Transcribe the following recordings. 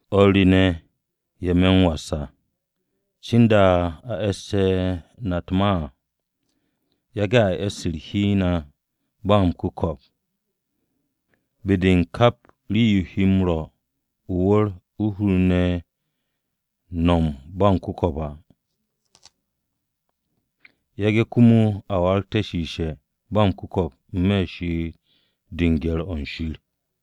O̱r re ne̱, ye̱ me̱ m-was à, cinda a e̱ssu̱te̱ na u̱t-ma à, yage̱ a e̱sste̱ hi u̱n na ba m-ku̱ko̱p, be-de kap rii-yo he m-rwo̱ o-wu̱r u̱r-hur ne̱ nom ba m-ku̱ko̱p á. Yage̱ komo a waragte̱ shiishe̱ ba m-ku̱ko̱p n-me̱ u̱r-she'et de u̱n gye̱r-o̱ u̱n Shir.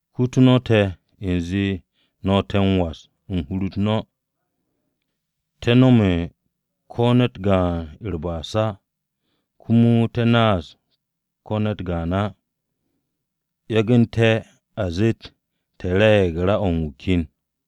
Kutu no̱ te̱ u̱nze no̱ te̱ m-was u̱n hur-u̱t no̱. Te̱ nome̱ ko̱ ne̱t gaan u̱r-ba'as á, komo te̱ naas ko̱ ne̱t gaan á, yagu̱nte̱ a zet te̱ re̱e̱g ra-o u̱n wu̱ ken.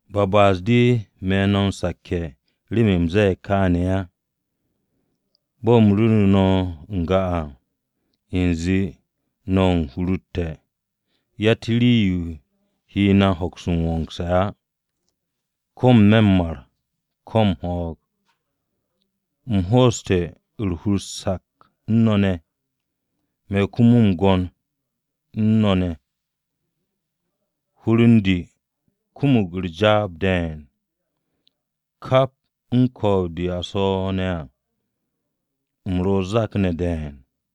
Ba ba'as-de me̱ no̱ m-sakke̱ remen u̱m ze̱e̱g kaane̱ á. Bo̱ u̱m ru̱ru̱ no̱ n-ga à, u̱nze no̱ u̱n hur-u̱r te̱, yatt rii-yo he na m-hoks m-wongse̱ á, ko̱ n-me̱ m-mar ko̱ m-ho̱o̱g. U̱m ho'oste̱ u̱r-hur sak u̱n no̱ ne̱, me̱ komo m-gwo̱n u̱n no̱ ne̱. Hur u̱n de kumug jaab de̱e̱n. Kap u̱n ko̱o̱b-de a swo̱ ne̱ à, u̱m ro̱ o-zak ne̱ de̱e̱n.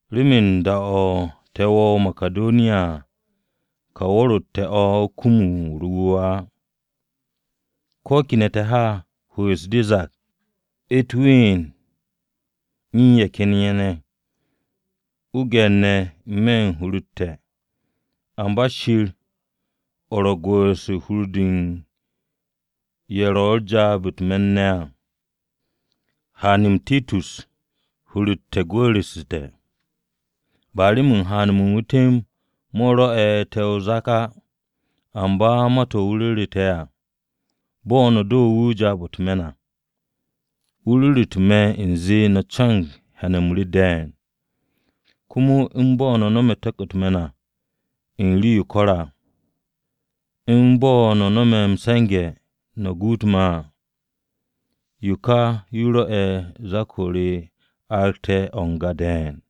Remen da-o̱ te̱ wo̱o̱ o-Makidoniya à, ka wu̱r-o te̱ o̱ kum u̱r-wu̱we̱ á. Ko̱ kene̱ te̱ ha, hwu̱'u̱s-de zak, u̱t-ween u̱n ye̱ ken ye̱ ne̱, o-gye̱r ne̱ n-me̱ u̱n hur-u̱t te̱. Amba Shir, o̱ ro̱ u̱n gwu̱'u̱rse̱ u̱n hur-de u̱n ye̱ ro̱tte̱ jaab-o̱ u̱t-me̱n á, haan-m Titus hur-u̱t te̱ gwu̱'u̱rsu̱te̱. Ba remen haan-mo̱ u̱n wu̱ temb mo̱ rwo̱'u̱ te̱ o-zak á, amba ma-to̱ wu̱ ru̱ru̱ te̱ à. Bo̱ no̱ do wu̱ jaab-o̱ u̱t-me̱n à. Wu̱ ru̱ru̱te̱ te̱ u̱nze no̱ co̱no̱g hyan-m re de̱e̱n, komo u̱n bo̱ no̱ nome̱ tu̱k-mo̱ u̱t-me̱n à, u̱n rii-yo ko̱re̱ à. U̱n bo̱ no̱ no̱me̱ m-se̱nge̱ no̱ guut me̱ à. Yo ka yo rwo̱'e̱ zak-o re aragte̱ o̱ n-ga de̱e̱n.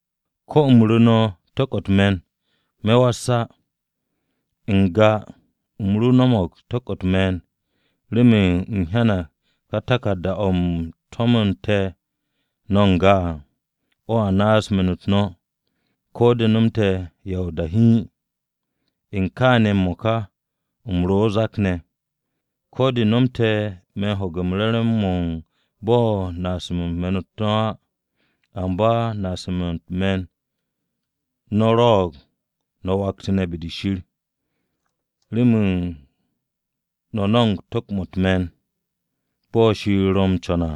Ko̱ u̱m ru̱ no̱ tu̱k-mo̱ u̱t-me̱n, me̱ was á. N-ga u̱m ro no̱mo̱g tu̱k-mo̱ u̱t-me̱n, remen u̱m hyanag ká taku̱rda-o̱ u̱m to̱mo̱nte̱ no̱ n-ga à, o̱ naaste̱ me̱n-u̱t no̱, ko̱ de nomte̱ ya o-da hiin. U̱n kaane̱ m-mo̱ka u̱m ro̱ o-zak ne̱. Ko̱ de nomte̱ me̱ ho̱ge̱ re̱re̱m-mo̱ u̱n bo̱ u̱m naase̱ me̱n-u̱t no̱ á, amba naase̱-mo̱ u̱n me̱n-u̱t no̱ rwo̱'o̱g no̱ waktu̱nte̱ be-de Shir. Remen no̱ no̱mo̱g tu̱k-mo̱ u̱t-me̱n bo̱ Shir ro co̱nge̱ à,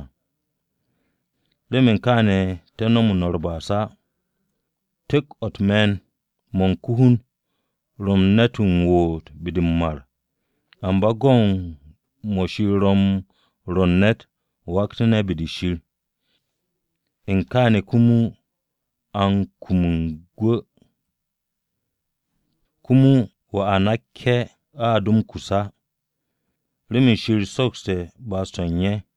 remen kaane̱ te̱ nomo no̱ u̱r-ba'as á. Tu̱k-mo̱ u̱t-me̱n mo̱ u̱n ko-hun ro̱ ne̱t m-woot be-de m-mar. Amba go̱n mo̱ Shir ro̱ m-rwo̱ ne̱t m-waktu̱ne̱ be-de Shir, u̱n kaane̱ komo a kum gwu̱. Komo wanakke̱-o a do m-kus á, remen Shir sokste̱ ba'as-to̱ u̱n ye̱.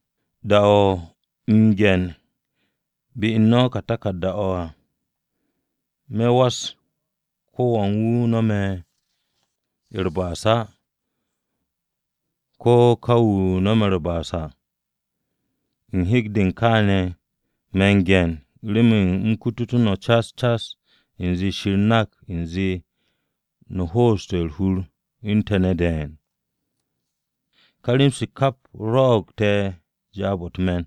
Da-o u̱m m-ge̱nbe̱ no̱ ká taku̱rda-o̱ à, me̱ was ko-wan-wu̱ nome̱ u̱r-ba'as á, ko̱ ka wu̱ a nome̱ u̱r-ba'as à. U̱n hek-de u̱n kaane̱ me̱ u̱n ge̱n remen u̱m kututú̱ no̱ cas cas u̱nze Shir nak u̱nze no̱ ho'oste̱ u̱r-hur u̱n te̱ ne̱ de̱e̱n. Ka rem-se kap rwo̱'o̱g te̱ jaab-o̱ u̱t-me̱n.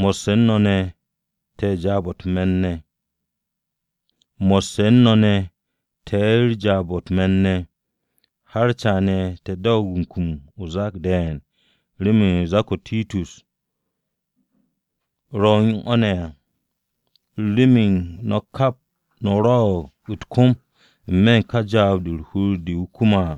Mo̱sse̱ u̱n o̱ ma te̱ jaab-o̱ u̱t-me̱n o̱ ne̱, har caane̱ te̱ doog kum o-zak de̱e̱n remen zak-o̱ Titus ro̱ u̱n o̱ ne̱ à, remen no̱ kap no̱ rwo̱'o̱g u̱t-kom n-me̱ u̱n ka jaab-o̱ u̱r-hur o̱ wu̱ kume̱ à.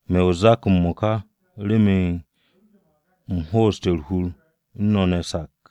Me̱ o-zak m-mo̱ka remen u̱m ho'oste̱ u̱r-hur u̱n no̱ ne̱ sak.